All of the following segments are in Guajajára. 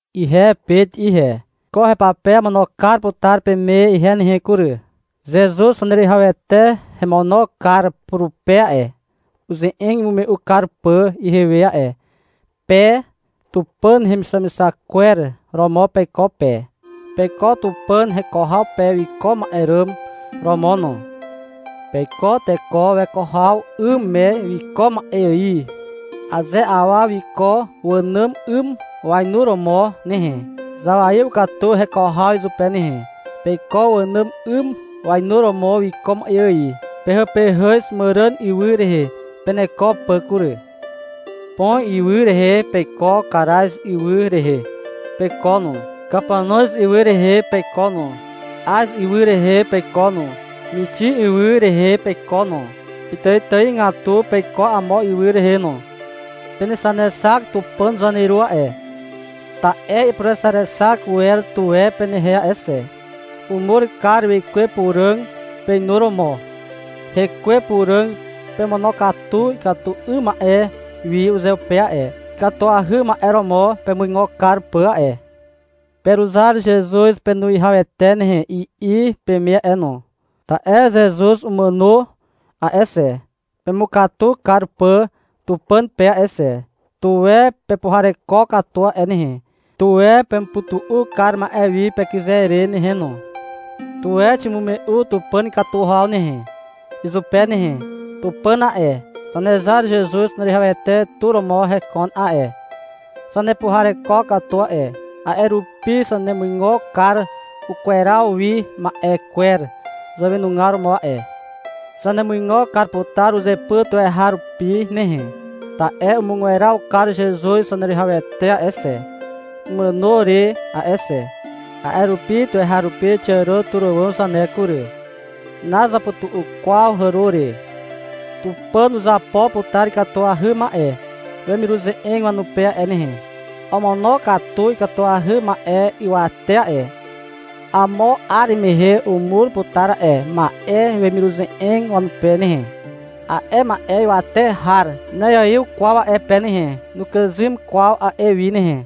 Ihe Pet ihe. Ko hepape amono kar putar peme ihe nehe kury. Zezuz Zaneruwihawete hemono kar purupe a'e, uze'eg imume'u kar pà ihewe a'e. Pe Tupàn hemixamixak kwer romo peiko pe. Peiko Tupàn heko haw pe wiko ma'e ràm romo no. Peiko teko weko haw 'ym me wiko ma'e ài. Aze awa wiko wànàm 'ym wainuromo nehe, zawaiw katu heko haw izupe nehe. Peiko wànàm 'ym wainuromo wiko ma'e ài. Pehàpehàz màràn ywy rehe peneko pà kury. Pon ywy rehe peiko, Karaz ywy rehe peiko no, Kapanoz ywy rehe peiko no, Az ywy rehe peiko no, Mixin ywy rehe peiko no. Pitàitàigatu peiko amo ywy rehe no. Penexanexak Tupàn Zaneru a'e, ta'e ipurexaexak wer tuwe penehe a'e xe. Umur kar Wekwe Puràg peinuromo. Hekwe Puràg pemonokatu ikatu 'ym ma'e wi uzeupe a'e, ikatuahy ma'e romo pemuigo kar pà a'e. — Peruzar Zezuz Penuwihawete nehe, i'i peme a'e no. Ta'e Zezuz umàno a'e xe, pemukatu kar pà Tupàn pe a'e xe. Tuwe pepuhareko katu a'e nehe. Tuwe pemupytu'u kar ma'e wi pekyze re nehe no. Tuwe ximume'u Tupàn ikatu haw nehe, izupe nehe. Tupàn a'e, Zanezar Zezuz Zaneruwihawete tu romo hekon a'e. Zanepuhareko katu a'e, a'e rupi zanemuigo kar ukweraw wi ma'e kwer zàwenugar romo a'e. Zanemuigo kar putar uzepyr tuweharupi nehe. Ta'e umugweraw kar Zezuz Zaneruwihawete a'e xe, imàno re a'e xe. A'e rupi tuweharupi xiàro tur àwàm zane kury. Nazapytu'u kwaw hàro re. Tupàn uzapo putar ikatuahy ma'e wemiruze'eg wanupe a'e nehe. Omonokatu ikatuahy ma'e ywate a'e. Amo 'ar mehe umur putar a'e ma'e wemiruze'eg wanupe nehe. A'e ma'e ywate har na'iaiw kwaw a'e pe nehe. Nukàzym kwaw a'e wi nehe.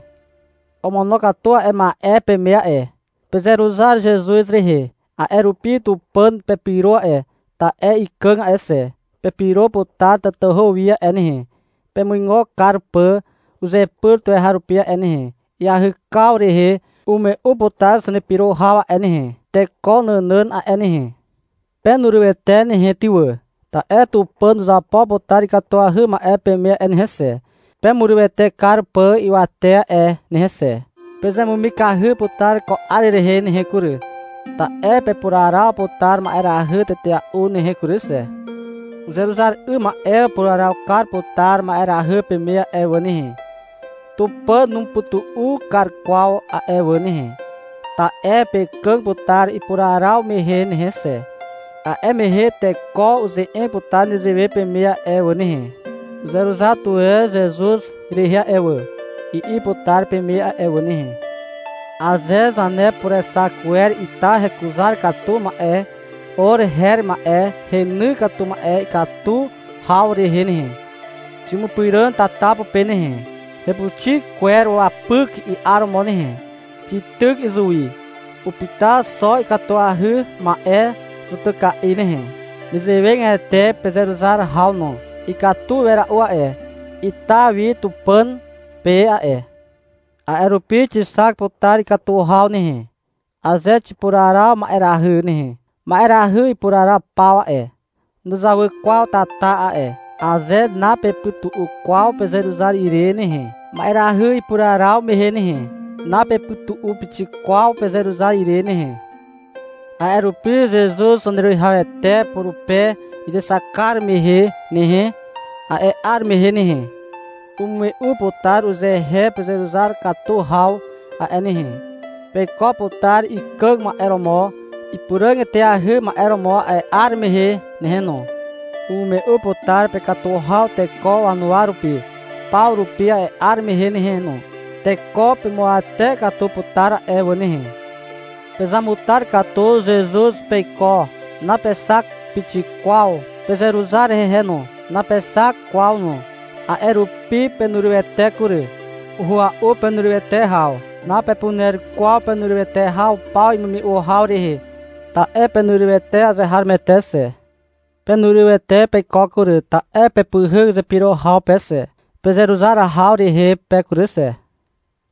Omonokatu a'e ma'e peme a'e. Pezeruzar Zezuz rehe. A'e rupi Tupàn pepyro a'e, ta'e ikàg a'e xe. Pepyro putar tatahu wi a'e nehe, pemuigo kar pà uzepyr tuweharupi a'e nehe. Iahykaw rehe umume'u putar zanepyro haw a'e nehe, teko nànàn a'e nehe. Penurywete nehe ty wà, ta'e Tupàn uzapo putar ikatuahy ma'e peme a'e nehe xe, pemurywete kar pà ywate a'e nehe xe. Pezemumikahy putar ko 'ar rehe nehe kury, ta'e pepuraraw putar ma'erahy tetea'u nehe kury xe. Uzeruzar 'ym ma'e upuraraw kar putar ma'erahy peme a'e wà nehe. Tupàn numupytu'u kar kwaw a'e wà nehe. Ta'e pekàg putar ipuraraw mehe nehe xe. A'e mehe teko uze'eg putar nezewe peme a'e wà nehe. — Uzeruzar tuwe Zezuz rehe a'e wà, i'i putar peme a'e wà nehe. Aze zanepurexak wer ita hekuzar katu ma'e or her ma'e heny katu ma'e ikatu haw rehe nehe, ximupyràn tata pupe nehe. Hepuxi kwer wapyk i'aromo nehe. Xityk izuwi. Upyta xo ikatuahy ma'e zutyka'i nehe. Nezewegatete pezeruzar haw no. Ikatu wera'u a'e ita wi Tupàn pe a'e. A'e rupi xixak putar ikatu haw nehe, aze xipuraraw ma'erahy nehe. Ma'erahy ipuraraw paw a'e, nuzawy kwaw tata a'e. Aze napepytu'u kwaw pezeruzar ire nehe, ma'erahy ipuraraw mehe nehe, napepytu'u pixik kwaw pezeruzar ire nehe. A'e rupi Zezuz Zaneruwihawete purupe izexak kar mehe nehe, a'e 'ar mehe nehe, umume'u putar uzehe pezeruzar katu haw a'e nehe. Peiko putar ikàg ma'e romo ipuràg eteahy ma'e romo a'e 'ar mehe nehe no. Umume'u putar pekatu haw teko wanuwa rupi paw rupi a'e 'ar mehe nehe no. Teko pemuawate katu putar a'e wà nehe. Pezamutar katu Zezuz peiko. Napexak pixik kwaw. Pezeruzar hehe no. Napexak kwaw no. A'e rupi penurywete kury. Uhua'u penurywete haw. Napepuner kwaw penurywete haw paw imume'u haw rehe, ta'e penurywete azeharomoete xe. Penurywete peiko kury, ta'e pepyhyk zepyro haw pe xe. Pezeruzar haw rehe pe kury xe.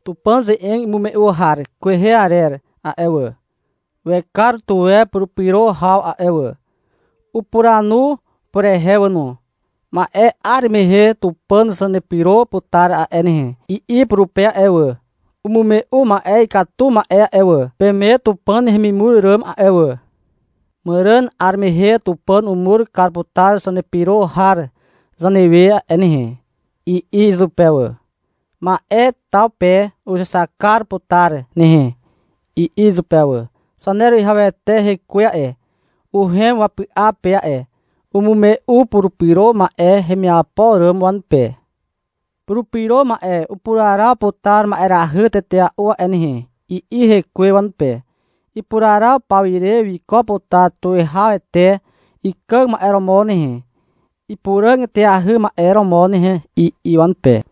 Tupàn ze'eg imume'u har kwehe arer a'e wà, wekar tuwe purupyro haw a'e wà. Upuranu purehe wà no. — Ma'e 'ar mehe Tupàn zanepyro putar a'e nehe, i'i purupe a'e wà. Umume'u ma'e ikatu ma'e a'e wà, peme Tupàn hemimur ràm a'e wà. — Màràn 'ar mehe Tupàn umur kar putar zanepyro har zanewe a'e nehe, i'i izupe wà. — Ma'e taw pe uzexak kar putar nehe, i'i izupe wà. Zaneruwihawete Hekwe a'e, uhem wapy'a pe a'e. Umume'u Purupyro Ma'e hemiapo ràm wanupe. — Purupyro ma'e upuraraw putar ma'erahy tetea'u a'e nehe, i'i Hekwe wanupe. — Ipuraraw paw ire wiko putar tuwihawete ikàg ma'e romo nehe, ipuràg eteahy ma'e romo nehe, i'i wanupe.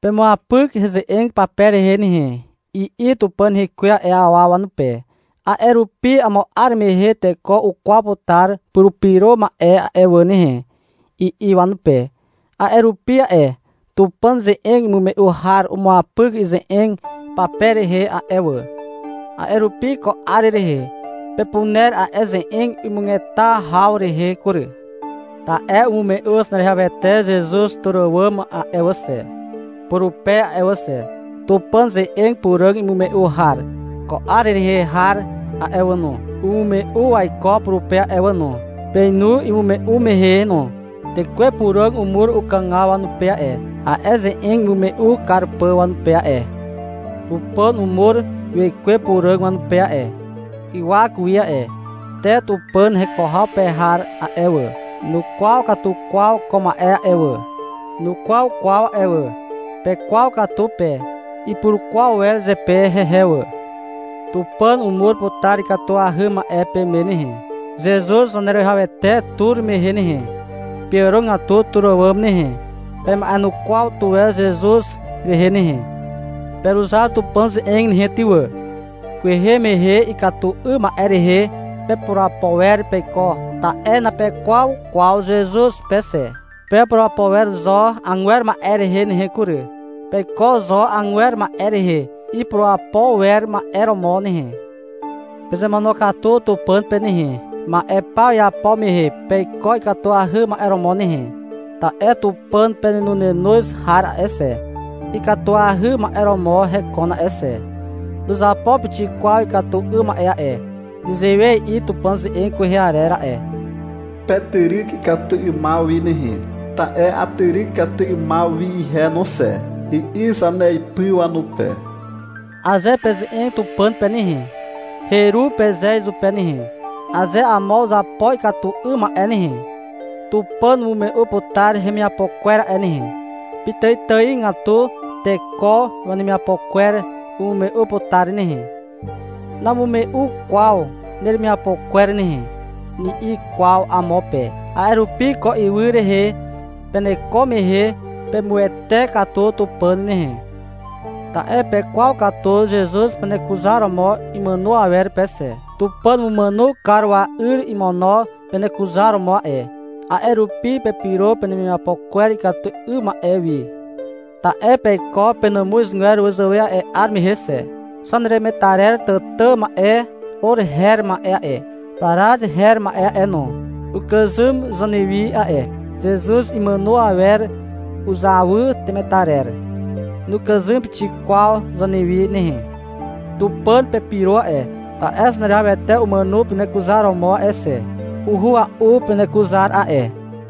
— Pemuapyk heze'eg pape rehe nehe, i'i Tupàn Hekwe a'e awa wanupe. — A'e rupi amo 'ar mehe teko ukwaw putar Purupyro Ma'e a'e wà nehe, i'i wanupe. A'e rupi a'e Tupàn ze'eg imume'u har umuapyk ize'eg pape rehe a'e wà. A'e rupi ko 'ar rehe pepuner a'e ze'eg imugeta haw rehe kury. Ta'e umume'u Zaneruwihawete Zezuz tur àwàm a'e wà xe, purupe a'e wà xe. Tupàn ze'eg puràg imume'u har ko 'ar rehe har a'e wà no, umume'u waiko purupe a'e wà no. Peinu imume'u mehe no. Tekwe Puràg umur ukàgaw wanupe a'e, a'e ze'eg imume'u kar pà wanupe a'e. Tupàn umur Wekwe Puràg wanupe a'e, ywak wi a'e. Te Tupàn heko haw pe har a'e wà, nukwaw katu kwaw ko ma'e a'e wà. Nukwaw kwaw a'e wà. Pekwaw katu pe. Ipurukwaw wer zepe hehe wà. Tupàn umur putar ikatuahy ma'e peme nehe, Zezuz Zaneruwihawete tur mehe nehe. Peàrogatu tur àwàm nehe. Pema'enukwaw tuwe Zezuz rehe nehe. Peruzar Tupàn ze'eg nehe ty wà. Kwehe mehe ikatu 'ym ma'e rehe pepurapo wer peiko, ta'e napekwaw kwaw Zezuz pe xe. Pepurapo wer zo agwer ma'e rehe nehe kury. Peiko zo agwer ma'e rehe ipurapo wer ma'e romo nehe. Pezemonokatu Tupàn pe nehe. Ma'e paw iapo mehe peiko ikatuahy ma'e romo nehe. Ta'e Tupàn penenonenoz har a'e xe, ikatuahy ma'e romo hekon a'e xe. Nuzapo pixik kwaw ikatu 'ym ma'e a'e. Nezewe i'i Tupàn ze'eg kwehe arer a'e. — Petyryk ikatu 'ymaw wi nehe, ta'e atyryk ikatu 'ymaw wi ihe no xe, i'i zaneipy wanupe. Aze peze'eg Tupàn pe nehe, — Heru, peze izupe nehe. Aze amo uzapo ikatu 'ym ma'e nehe, Tupàn umume'u putar hemiapo kwer a'e nehe. Pitàitàigatu teko wanemiapo kwer umume'u putar nehe. — Namume'u kwaw neremiapo kwer nehe, ni'i kwaw amo pe. A'e rupi, ko ywy rehe peneko mehe pemuwete katu Tupàn nehe. Ta'e pekwaw katu Zezuz penekuzaromo imàno awer pe xe. Tupàn umumàno kar wa'yr imono penekuzaromo a'e. A'e rupi pepyro penemiapo kwer ikatu 'ym ma'e wi. Ta'e peiko penàmuzgwer wazàwe a'e 'ar mehe xe. Zaneremetarer tàtà ma'e or her ma'e a'e, parat her ma'e a'e no, ukàzym zanewi a'e. Zezuz imàno awer uzawy temetarer. Nukàzym pixik kwaw zanewi nehe. Tupàn pepyro a'e, ta'e Zaneruwihawete umàno penekuzaromo a'e xe. Uhua'u penekuzar a'e.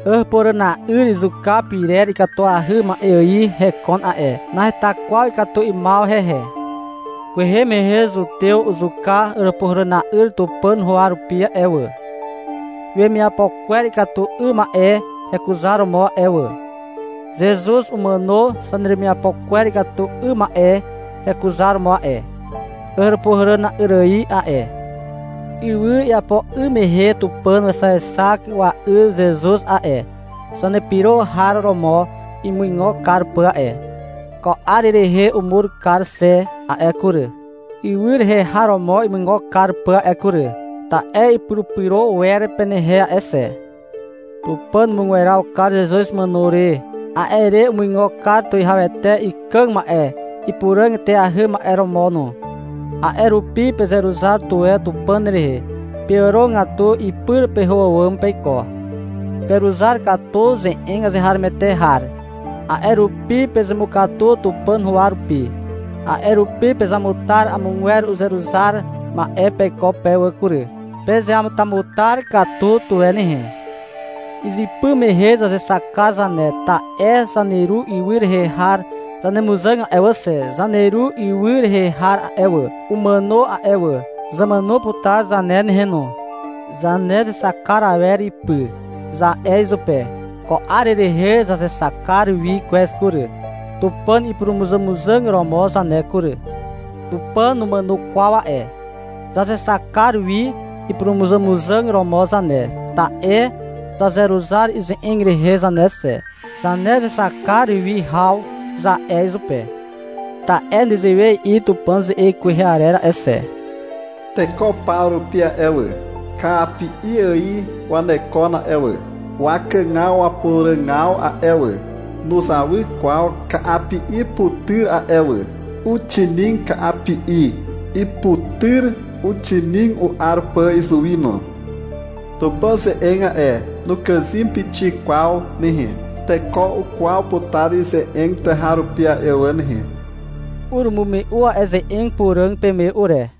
Àràpuhàràna'yr izuka pyrer ikatuahy ma'e ài hekon a'e. Naheta kwaw ikatu 'ymaw hehe. Kwehe mehe zutew uzuka Àràpuhàràna'yr Tupàn huwa rupi a'e wà, wemiapo kwer ikatu 'ym ma'e hekuzaromo a'e wà. Zezuz umàno zaneremiapo kwer ikatu 'ym ma'e hekuzaromo a'e, Àràpuhàràna'yr ài a'e. Ywy iapo 'ym mehe Tupàn wexaexak wa'yr Zezuz a'e, zanepyro har romo imuigo kar pà a'e. Ko 'ar rehe umur kar xe a'e kury, ywy rehe har romo imuigo kar pà a'e kury. Ta'e ipurupyro wer penehe a'e xe. Tupàn umugweraw kar Zezuz imàno re. A'e re umuigo kar tuwihawete ikàg ma'e ipuràg eteahy ma'e romo no. A'e rupi pezeruzar tuwe Tupàn rehe. Peàrogatu ipyr peho àwàm peiko. Peruzar katu ze'eg azeharomoete har. A'e rupi pezemukatu Tupàn huwa rupi. A'e rupi pezamutar amogwer uzeruzar ma'e peiko pe wà kury. Pezeamutamutar katu tuwe nehe. Izypy mehe zazexak kar zane, ta'e zaneru ywy rehe har zanemuzàg a'e wà xe. Zaneru ywy rehe har a'e wà, umàno a'e wà. Zamàno putar zane nehe no. — Zanezexak kar awer ipy, za'e izupe. Ko 'ar rehe zazexak kar wi kwez kury, Tupàn ipurumuzàmuzàg romo zane kury. Tupàn numàno kwaw a'e. Zazexak kar wi ipurumuzàmuzàg romo zane, ta'e zazeruzar ize'eg rehe zane xe. — Zanezexak kar wi haw, za'e izupe. Ta'e nezewe i'i Tupàn ze'eg kwehe arer a'e xe. Teko paw rupi a'e wà, Ka'api'i ài wanekon a'e wà. Wakàgaw wapuràgaw a'e wà, Nuzawy kwaw ka'api'i putyr a'e wà. Uxinig ka'api'i. Iputyr uxinig u'ar pà izuwi no. Tupàn ze'eg a'e, Nukàzym pixik kwaw nehe. Teko ukwaw putar ize'eg tuweharupi a'e wà nehe. Urumume'u a'e ze'eg puràg peme ure.